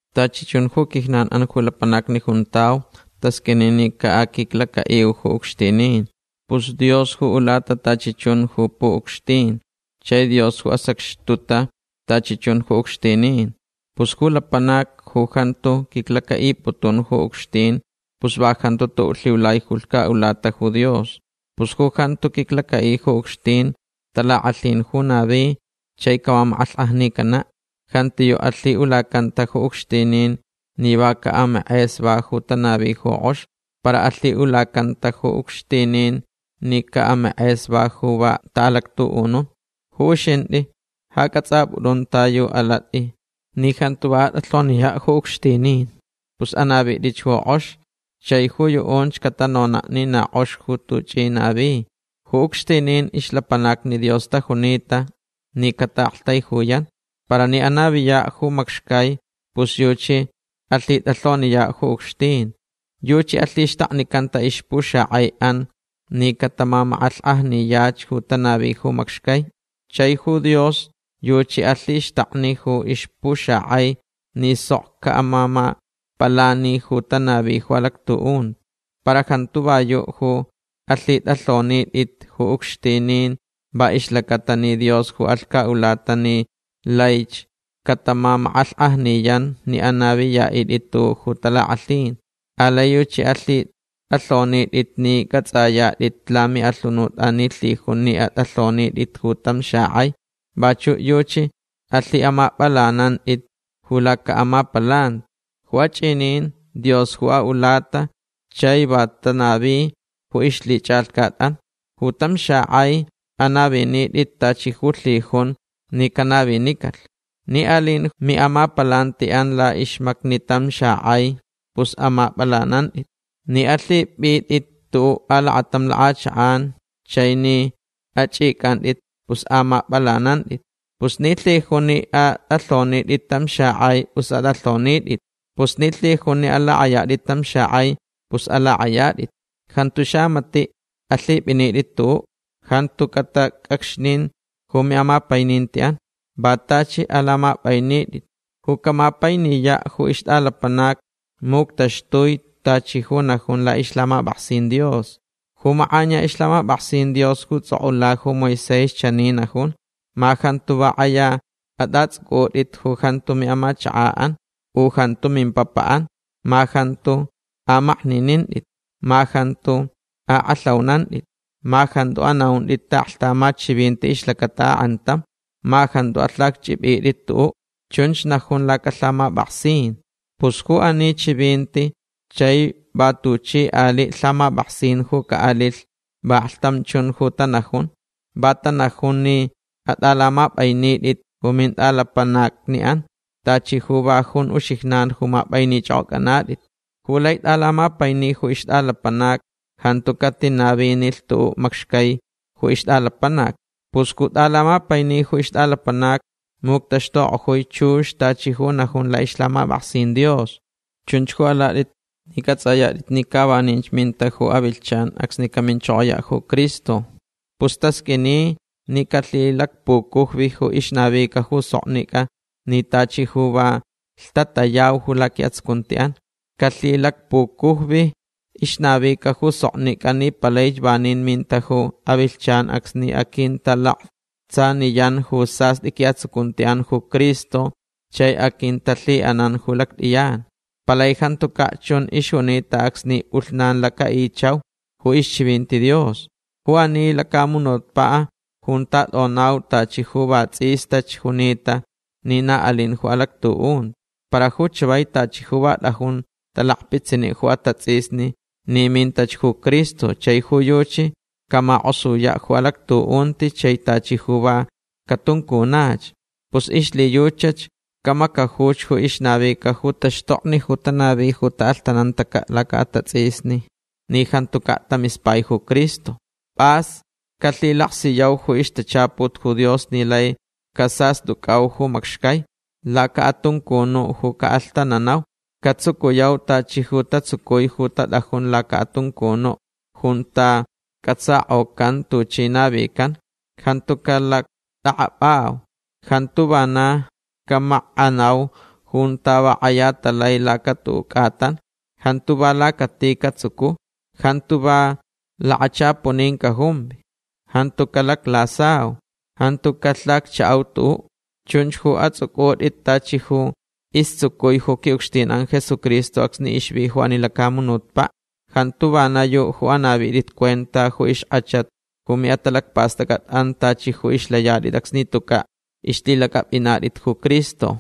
Tachi chun ju quijnanʼan ju lapanacni juntau tasqʼuini ni caʼaquiclacaʼiu ju ucxtinin. Pus Dios ju ulata tachi chun ju puʼucxtin chai Dios ju asacxtuta tachi chun ju ucxtinin. Pus ju lapanac ju jantu quiclacaʼiputun ju ucxtin pus va jantu tuʼuʼ lhiulai ju lhcaʼulata ju Dios. Pus ju jantu quiclacaʼi ju ucxtin talakʼalhin ju navi chai camamakʼalhkʼajnicanaʼ. Jantiyuʼ alhiʼulacanta ju ucxtinin ni va caʼamakʼesva ju tanavi ju kʼox. Para alhiʼulacanta ju ucxtinin ni caʼamakʼesva ju va taʼalactuʼunun. Ju uxintʼi ja cʼatsʼapʼutʼun ta yu alatʼi ni jantu va atʼalhoniyaʼ ju ucxtinin. Pus anavitʼich ju kʼox chai ju yuʼunch catanonaʼ ni na kʼox ju tuchʼi navitʼi. Ju ucxtinin ixlapanacni Dios tajunita ni cataʼaktaijuyan. Para ni anaviyaʼ ju macxcai pus yuchi alhitʼalhoniyaʼ ju ucxtin. Yuchi alhixtaknicanta ixpuxakʼaiʼan ni catamamakʼalhkʼajniyach ju tanavi ju macxcai. Chai ju Dios yuchi alhixtakni ju ixpuxakʼai ni sok caʼamamapalanilh ju tanavich ju alactuʼunti. Para jantu va yuʼ ju alhitʼalhonitʼit ju ucxtinin va ixlacaʼatalh ni Dios ju alhcaʼulata ni laich catamamakʼalhkʼajniyan ni anaviyaʼitʼit tuʼuʼ talakʼalhin. Alai yuchi alhitʼalhonitʼit ni cʼatsʼayatʼit lamiʼalhunutʼan ni lhijun ni atʼalhonitʼit ju tam xakʼai. Vachuʼ yuchi alhiʼamapʼalanantʼit ju lacaʼamapalanti. Ju achʼinin Dios ju aʼulata chai va tanavich ju ixlhichʼalhcatʼan. Ju tam xakʼai anavinitʼitch tachi ju lhijunch ni canavinicalh. Ni alinch ju miʼamapalantiʼan laʼixmacni tam xakʼai pus amapʼalanantʼitch. Ni alhipʼitʼit tuʼuʼ alakatam lakʼachakʼan chai ni achʼicʼantʼit pus amapʼalanantʼit. Pus ni lhijunch ni atʼalhonitʼit tam xakʼai pus atʼalhonitʼit. Pus ni lhijunch ni alakʼayatʼit tam xakʼai pus alakʼayatʼitch. Jantu xamatiʼ alhipʼinitʼit tuʼuʼ. Jantu catacʼacxnin ju miʼamapainintiʼan. Va tachi alamapʼainitʼit. Ju camapainiyaʼ ju ixtʼalapanac muctaxtui tachi ju najun laʼixlhamapʼaksin Dios. Ju makʼaniya ixlhamapʼaksin Dios ju tsʼokʼula ju Moisés chani najun: “Ma jantu va kʼaya atʼatsʼucʼutʼit ju jantu miʼamachakaʼan u jantu mimpapaʼan. Ma jantu amakninintʼit. Ma jantu akʼalhaunantʼit. Ma jantu anaʼuntʼit taʼaklhtamat chivinti ixlacata akʼantam. Ma jantu alhacchʼipʼitʼit tuʼuʼ”. Chunch najun lacalhamapʼaksin. Pus ju ani chivinti chai va tuchi aliʼ lhamapʼaksin ju caʼalilh vaklhtam chun ju tanajun. Va tanajun ni atʼalamapʼainitʼit ju mintʼalapanacniʼan tachi ju va jun uxijnan ju mapʼainichʼokʼocʼanatʼit. Ju lai tʼalamapaini ju ixtʼalapanac jantu catinavinilh tuʼuʼ macxcai ju ixtʼalapanac. Pus ju tʼalamapaini ju ixtʼalapanac muctaxtukʼojui chux tachi ju najun laʼixlhamapʼaksin Dios. Chunch ju alatʼit ni cʼatsʼayatʼit ni ca vaninch minta ju avilhchan acsni caminchokoyaʼ ju Cristo. Pus tasqʼuini ni calhilacpucujvich ju ixnavica ju soknicʼa ni tachi ju va lhtatayauch ju laquiʼatsucuntiʼan. Calhilacpucujvich ixnavica ju soknicʼa ni palaich vanin minta ju avilhchan acsni aquintalaktsaniyan ju sastʼi quiʼatsucuntiʼan ju Cristo chai aquintalhiʼanan ju lactʼiyan. Palai jantucaʼ chun ixjunita acsni pʼulhnan lacaʼichauch ju ixchivinti Dios. Ju ani lacamunutpaʼ junta tʼonau tachi ju va tsʼistach junita ni na alin ju alactuʼunti. Para ju chavai tachi ju va tʼajun talakpitsiniʼ ju atatsʼisni ni mintach ju Cristo chai ju yuchi camakʼosuyaʼ ju alactuʼunti chai tachi ju va catuncunach. Pus ixlhiyuchach camacajuch ju ixnavica ju taxtokni ju tanavi ju taʼalhtanantacaʼ lacaʼatatsʼisni ni jantucaʼ tamispai ju Cristo. Pʼas calhilaksiyau ju ixtachaput ju Dios ni lai casastʼucʼau ju macxcai. Lacaʼatuncunuʼ ju caʼalhtananau. Catsucuyauch tachi ju tatsucui ju tatʼajun lacaʼatuncunuʼ junta cʼatsakʼocanta tuchi navican. Jantu calactʼakʼapʼau. Jantu vanach camakʼanau junta va kʼaya talai lacatuʼuʼ cʼatan. Jantu va lacati catsucu. Jantu va lakachapunin cajumvi. Jantu calaclasau. Jantu calhacchaʼau tuʼuʼ. Chunch ju atsʼucʼutʼit tachi ju istsucui ju quiʼucxtinʼan Jesucristo acsni ixvi ju ani lacamunutpaʼ. Jantu vana yuʼ ju anavitʼit cuenta ju ixkʼachat ju miʼatalacpastʼacʼatʼan tachi ju ixlayatʼit acsni tucaʼ ixlhilacʼapʼinatʼit ju Cristo.